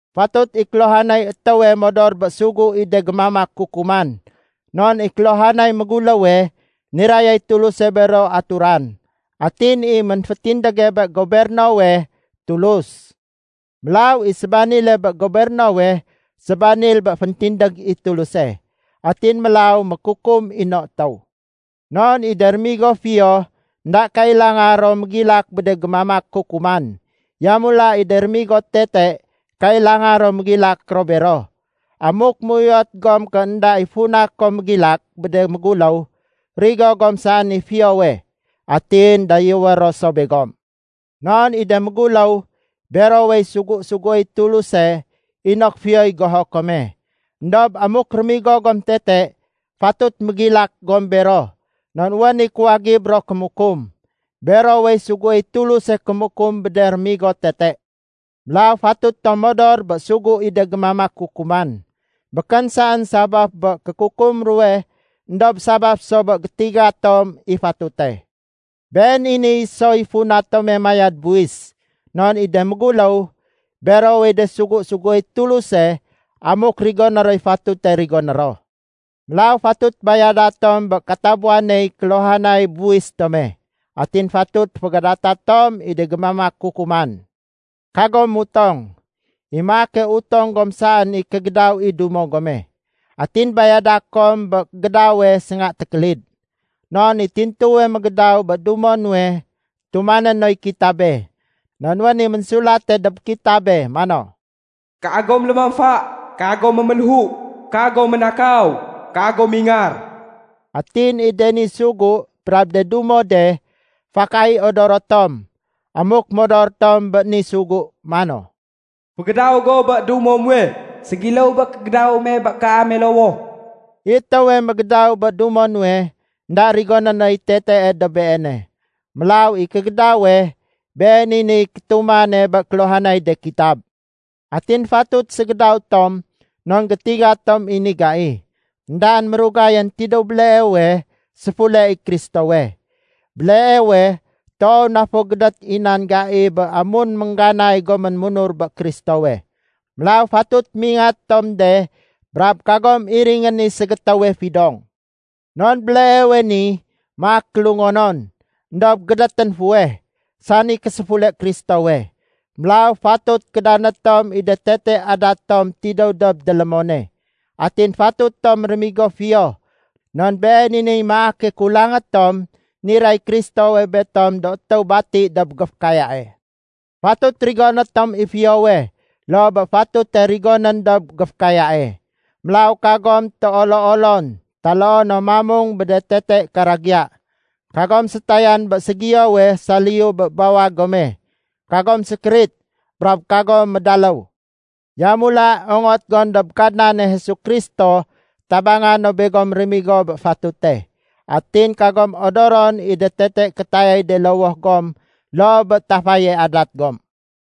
Fatut i kéluhanay étéwe modor bé sugu i de gémamak kukuman. Non i kéluhanay méguléwe, nirayay Tuluse bero aturan. Atin i ménfétindége bé gobernowe, Tulus. Mélaw i sébanile bé gobernowe, sébanil bé féntindég i Tuluse, atin mélaw mékukum i no étéw. Non i de rémigo fiyo énda kailanga ro mégilak bé de gémamak kukuman. Yamula i de rémigo tete kailanga ro mégilak ro bero. Amuk méuyot gom ké énda i funa kom mégilak bé de méguléw, rigo gom saén i fiyowe. Atin dayéwé ro so begom. Non i de méguléw, berowey sugu-suguéy Tuluse inok fiyoy goho kome. Endob amuk rémigo gom tete, fatut mégilak gom bero non wén i kuwagib ro kémukum. Berowey suguéy Tuluse kémukum bé de rémigo tete. Mélaw fatut tom modor bé sugu i de gémamak kukuman. Békén saén sabaf bé kékukum ruwe éndob sabaf so bé gétiga tom i fatute. Been i ni soy funa tome mayad buwis. Non i de méguléw, berowey de sugu suguéy Tuluse amuk rigoné roy fatute rigoné ro. Mélaw fatut bayada tom bé katabuwaney kéluhanay buwis tome. Atin fatut fégadata tom i de gémamak kukuman. Kagom mutong. I maake utong gom saén i kégédaw i dumo gome, atin bayada kom bé gédawe sénga tékélid. Non i tintuwe mégédaw bé dumo nuwe tumané noy kitabe. Non wén i ménsulate dob kitabe mano, “Kagom lémamfa. Kagom méméléhu. Kagom ménakaw. Kagom mingar.” Atin i de ni sugu brab de dumo de, fakay odoro tom amuk modor tom bé ni sugu mano, “Fégédaw go bé dumo muwe, ségiléw bé kégédaw me bé kaame lowoh.” I étéwe mégédaw bé dumo nuwe, énda rigoné noy tetee dob beene. Mélaw i kégédawe, been i niy kétumane bé kéluhanay de kitab. Atin fatut ségédaw tom non gétiga tom i ni gai. Endaén mérugayén tidéw béleewe, séfule i Kristowe. Béleewe toow na fo gédét i nan gai bé amun méngganay gomén munur bé Kristowe. Mélaw fatut mingat tom de brab kagom iringén i ségétéwe fidong. Non béleewe ni maak kélungonon éndob gédétén fuweh, sani késéfule Kristowe. Mélaw fatut kédané tom i de tete adat tom tidéw dob délémone. Atin fatut tom rémigo fiyo non been i niy maake kulangé tom niray Kristowe betom do étéw bati dob géfékayae. Fatut rigoné tom i fiyowe loo bé fatute rigonén dob géfékayae. Mélaw kagom téolo-olon, taloo no mamung bé de tete karagiya, kagom sétayan bé ségiyowe saliyu bé bawag gome, kagom sékérit, brab kagom médaléw. Yamula ongot gom dob Kadnane Jesu Kristo tabanga no begom rémigo bé fatute. Atin kagom odoron i de tete kétayay de lowoh gom loo bé tafaye adat gom.